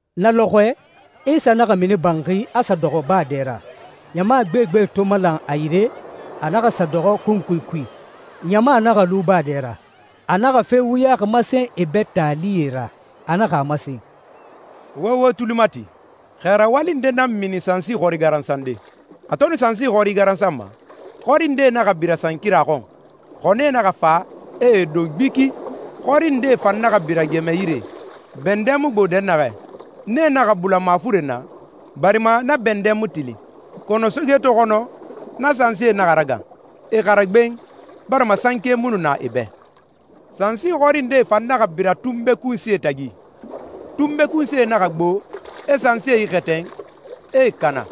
Na lɔxɔɛ, Isa naxa mini banxi, a sa dɔxɔ baa dɛ ra. Ɲama gbegbe to malan a yire, a naxa sa dɔxɔ kunkui kui, ɲama naxa lu baa dɛ ra. A naxa fe wuyaxi masen e bɛ taalie ra. A naxa a masen, «Wo wo tuli mati. Xɛ rawali nde nan mini sansi xɔri garansande. A to nu sansi xɔri garansanma, xɔri ndee naxa bira sankira xɔn, xɔnie naxa fa, e e don gbiki. Xɔri ndee fan naxa bira gɛmɛ yire, bɛndɛ mu gbo dɛnnaxɛ. Nee naxa bula mafuren na, barima na bɛndɛ mu tilin. Kɔnɔ soge to xɔnɔ, na sansie naxa ragan, e xara gben, barima sanke mu nu na e bɛ. Sansi xɔri ndee fan naxa bira tunbe kunsie tagi. Tunbe kunsie naxa gbo, e sansie ixɛtɛn, e e kana.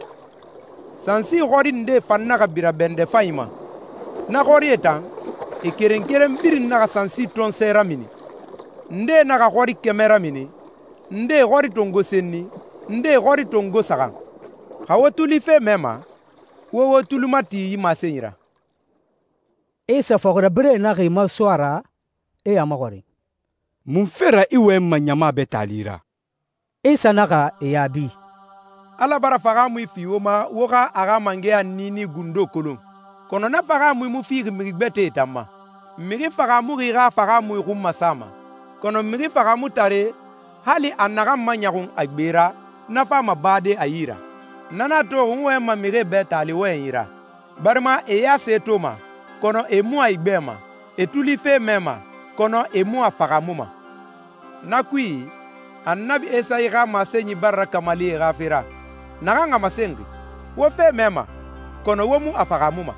Sansi xɔri ndee fan naxa bira bɛndɛ fanyi ma. Na xɔrie tan, e keren keren birin naxa sansi tɔnsɔɛ ramini, ndee naxa xɔri kɛmɛ ramini, ndee xɔri tongo senni, ndee xɔri tongo saxan. Xa wo tuli fe mɛma, wo wo tuli mati yi masenyi ra.» Isa fɔxirabirɛe naxa e maso a ra, e a maxɔrin, «Munfe ra i wɔyɛnma ɲama bɛ taali ra?» Isa naxa e yaabi, «Ala bara fahaamui fi wo ma wo xa a xa mangɛya niini gundo kolon, kɔnɔ na fahaamui mu fixi mixi gbɛtɛe tan ma. Mixi fahaamuxi xa fahaamui xun masama, kɔnɔ mixi fahaamutare, hali a naxan maɲɔxun a gbe ra, na fama bade a yi ra. Na nan a toxi n wɔyɛnma mixie bɛ taali wɔyɛnyi ra, barima e ya se toma, kɔnɔ e mu a igbɛma, e tuli fe mɛma, kɔnɔ e mu a fahaamuma. Na kui, Annabi Esayi xa masenyi bara rakamali e xa fe ra, naxan a masenxi, ‹Wo fe mɛma, kɔnɔ wo mu a fahaamuma.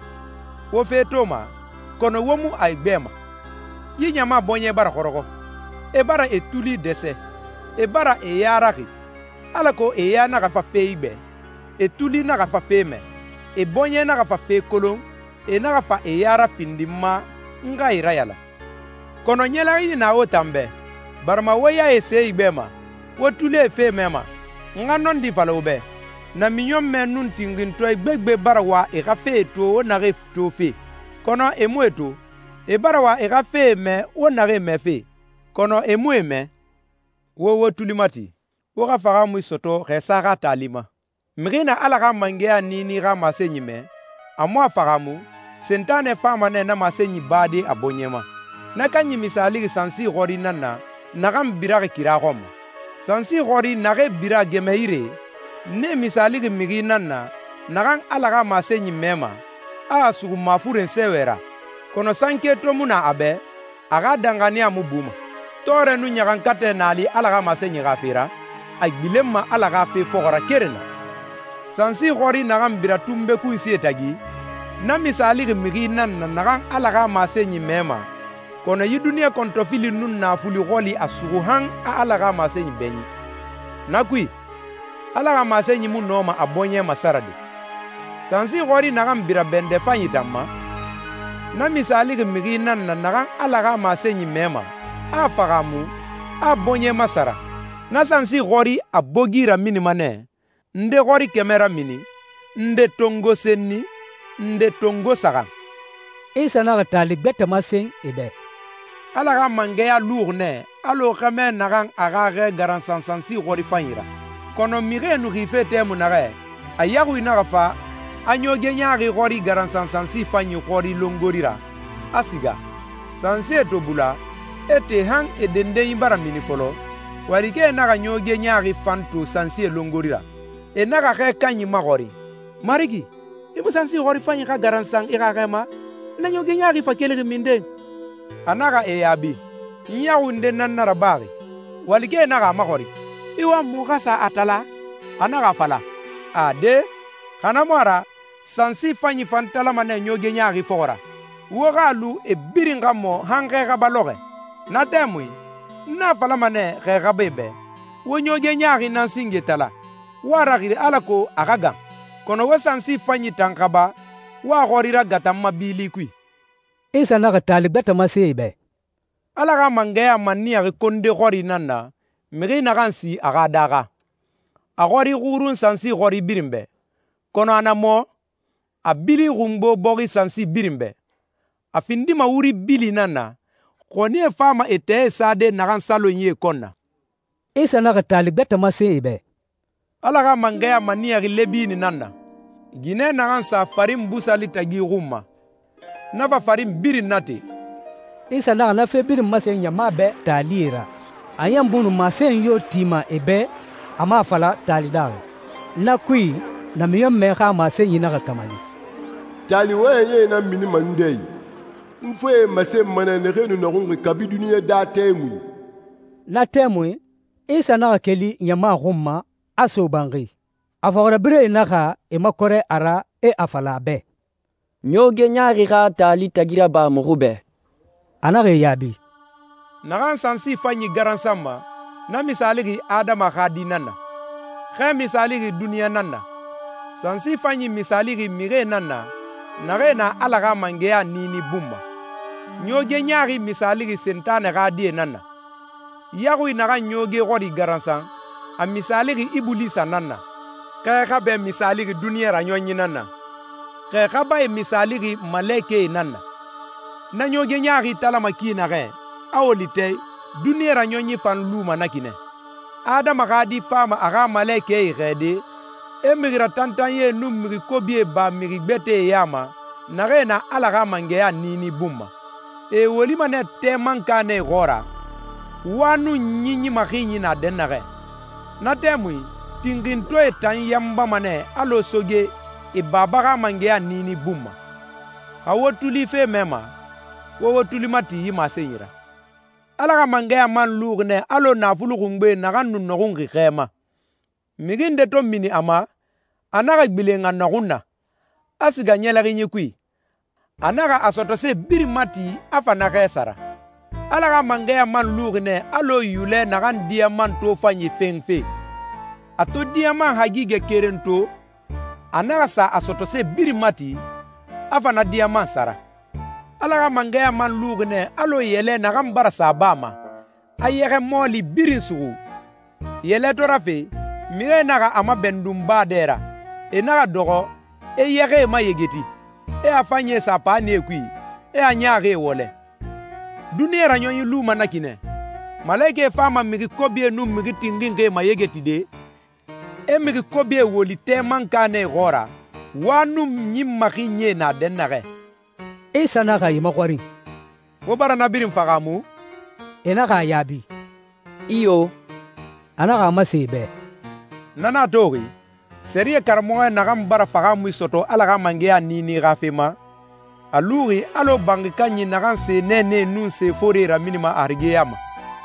Wo fe toma, kɔnɔ wo mu a igbɛma. Yi ɲama bɔɲɛ bara xɔrɔxɔ. E bara e tuli dɛsɛ, e bara e ya raxi, alako e ya naxa fa fe igbɛ, e tuli naxa fa fe mɛ, e bɔɲɛe naxa fa fe kolon, e naxa fa e ya rafindi n ma n xa e rayalan.›» «Kɔnɔ ɲɛlɛxinyi na wo tan bɛ, barima wo yae se igbɛma, wo tulie fe mɛma. N xa nɔndi fala wo bɛ, namiɲɔnmɛ nun tinxintɔɛ gbegbe bara wa e xa fee to wo naxee tofe, kɔnɔ e mu e to. E bara wa e xa fee mɛ wo naxee mɛfe, kɔnɔ e mu e mɛ.» «Wo wo tuli mati, wo xa fahaamui sɔtɔ xɛsa xa taali ma. Mixi na Ala xa mangɛya niini xa masenyi mɛ, a mu a fahaamu, Sentanɛ fama nɛ na masenyi bade a bɔɲɛ ma. Na kanyi misaalixi sansi xɔri nan na naxan biraxi kira xɔn ma. Sansi xɔri naxee bira gɛmɛ yire, nee misaalixi mixi nan na naxan Ala xa masenyi mɛma, a a suxu mafuren sɛɛwɛ ra. Kɔnɔ sanke to mu na a bɛ, a xa danxaniya mu buma. Tɔɔrɛ nun ɲaxankatɛ na a li Ala xa masenyi xa fe ra, a gbilenma Ala xa fe fɔxɔ ra keren na. Sansi xɔri naxan bira tunbe kunsie tagi, na misaalixi mixi nan na naxan Ala xa masenyi mɛma, kɔnɔ yi duniɲa kɔntɔfili nun naafuli xɔli a suxu han a Ala xa masenyi bɛɲin. Na kui, Ala xa masenyi mu nɔma a bɔɲɛ masarade. Sansi xɔri naxan bira bɛndɛ fanyi tan ma, na misaalixi mixi nan na naxan Ala xa masenyi mɛma, a a fahaamu, a a bɔɲɛ masara. Na sansi xɔri a bogi raminima nɛ, nde xɔri kɛmɛ ramini, nde tongo senni, nde tongo saxan.» Isa naxa taali gbɛtɛ masen e bɛ, «Ala xa mangɛya luxi nɛ alɔ xɛmɛ naxan a xa xɛ garansan sansi xɔri fanyi ra. Kɔnɔ mixie nu xife tɛmui naxɛ, a yaxui naxa fa, a ɲooge ɲaaxi xɔri garansan sansi fanyi xɔri longori ra, a siga. Sansie to bula, e te han e dendenyi bara mini fɔlɔ, walikɛe naxa ɲooge ɲaaxi fan to sansie longori ra. E naxa xɛ kanyi maxɔrin, ‹Marigi, i mu sansi xɔri fanyi xa garansan i xa xɛ ma? Na ɲooge ɲaaxi fa kelixi minden?› A naxa e yaabi, ‹N yaxui nde nan na rabaxi.› Walikɛe naxa a maxɔrin, ‹I wama muxu xa sa a tala?› A naxa a fala, ‹Ade, xa na mu a ra sansi fanyi fan talama nɛ ɲooge ɲaaxi fɔxɔ ra. Wo xa a lu e birin xa mɔ han xɛ xaba lɔxɔɛ. Na tɛmui n a falama nɛ xɛ xabae bɛ, wo ɲooge ɲaaxi nan singe tala, wo a raxiri alako a xa gan. Kɔnɔ wo sansi fanyi tan xaba, wo a xɔri ragata n ma bili kui.›» Isa naxa taali gbɛtɛ masen e bɛ, «Ala xa mangɛya maniyaxi konde xɔri nan na, mixi naxan si a xa daaxa. A xɔri xurun sansi xɔri birin bɛ, kɔnɔ a na mɔ, a bili xungbo bɔxi sansi birin bɛ. A findima wuri bili nan na, xɔnie fama e tɛɛe sade naxan salonyie kɔn na.» Isa naxa taali gbɛtɛ masen e bɛ, «Ala xa mangɛya maniyaxi lɛbini nan na, ginɛ naxan sa farin busali tagi xun ma, na fa farin birin nate.» Isa naxa na fe birin masen ɲama bɛ taalie ra. A ɲan mu nu masenyi yo tima e bɛ a mu a fala taali daaxi. Na kui, namiɲɔnmɛ xa masenyi naxa kamali, «Taali wɔyɛnyie nan minima n dɛ i. N fee masenma nɛ naxee nu nɔxunxi kabi duniɲa daa tɛmui.» Na tɛmui, Isa naxa keli ɲama xun ma, a so banxi. A fɔxirabirɛe naxa e makɔrɛ a ra, e a fala a bɛ, «Ɲooge ɲaaxi xa taali tagi raba muxu bɛ.» A naxa e yaabi, «Naxan sansi fanyi garansanma, na misaalixi Adama xa Di nan na. Xɛ misaalixi duniɲa nan na. Sansi fanyi misaalixi mixie nan na, naxee na Ala xa mangɛya niini bun ma. Ɲooge ɲaaxi misaalixi Sentanɛ xa die nan na. Yaxui naxan ɲooge xɔri garansan, a misaalixi Ibulisa nan na. Xɛ xabɛ misaalixi duniɲa raɲɔnyi nan na. Xɛ xabae misaalixi malekɛe nan na. Na ɲooge ɲaaxi talama ki naxɛ, a woli tɛ i, duniɲa raɲɔnyi fan luma na ki nɛ. Adama xa Di fama a xa malekɛe xɛɛde, e mixi ratantanyie nun mixi kobie ba mixi gbɛtɛe ya ma, naxee na Ala xa mangɛya niini bun ma. E e wolima nɛ tɛ mankanɛ xɔɔra, wa nun ɲin maxinyi na dɛnnaxɛ. Na tɛmui tinxintɔɛe tan yanbama nɛ alɔ soge e Baba xa mangɛya niini bun ma. Xa wo tuli fe mɛma, wo wo tuli mati yi masenyi ra.» «Ala xa mangɛya man luxi nɛ alɔ naafuli xungbe naxan nu nɔxunxi xɛ ma. Mixi nde to mini a ma, a naxa gbilen a nɔxun na, a siga ɲɛlɛxinyi kui. A naxa a sɔtɔse birin mati a fa na xɛ sara.» «Ala xa mangɛya man luxi nɛ alɔ yulɛ naxan diyaman tofanyi fenfe. A to diyaman hagigɛ keren to, a naxa sa a sɔtɔse birin mati, a fa na diyaman sara.» «Ala xa mangɛya man luxi nɛ alɔ yɛlɛ naxan bara sa baa ma, a yɛxɛ mɔɔli birin suxu. Yɛlɛ to rafe, mixie naxa a mabɛndun baa dɛ ra. E naxa dɔxɔ, e yɛxɛe mayegeti, e a fanyie sa paanie kui, e a ɲaaxie wɔlɛ. Duniɲa raɲɔnyi luma na ki nɛ. Malekɛe fama mixi kobie nun mixi tinxinxie mayegetide, e mixi kobie woli tɛ mankanɛ xɔɔra, wa nun ɲin maxinyie na dɛnnaxɛ.» Isa naxa e maxɔrin, «Wo bara na birin fahaamu?» E naxa a yaabi, «Iyo.» A naxa a masen e bɛ, «Na nan a toxi, sɛriyɛ karamɔxɔ naxan bara fahaamui sɔtɔ Ala xa mangɛya niini xa fe ma, a luxi alɔ banxi kanyi naxan se nɛɛnɛe nun se forie raminima a harige ya ma.»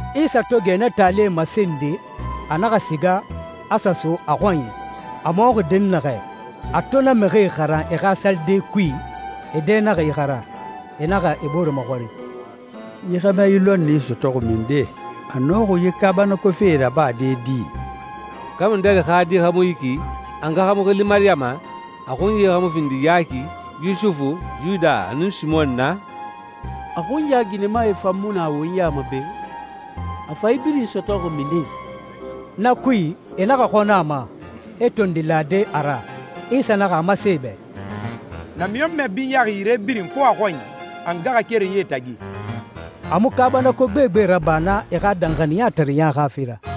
Isa to gɛ na taalie masende, a naxa siga, a sa so a xɔnyi, a mɔxi dɛnnaxɛ. A to na mixie xaran e xa salide kui, e dɛ naxa ixara. E naxa e bore maxɔrin, «Yi xɛmɛ yi lɔnni sɔtɔxi minden? A nɔxi yi kaabanako fee rabade di? Kamudɛri xa di xa mu yi ki? A nga xa mu xili Mariyama? A xunyae xa mu findi Yaki, Yusufu, Yuda, nun Simɔn na? A xunya ginɛmae fan mu na won ya ma be? A fa yi birin sɔtɔxi minden?» Na kui, e naxa xɔnɔ a ma, e tondi lade a ra. Isa naxa a masen e bɛ, «Namiɲɔnmɛ binyaxi yire birin fo a xɔnyi, a ngaxakerenyie tagi.» A mu kaabanako gbegbe raba naa e xa danxaniyatareɲa xa fe ra.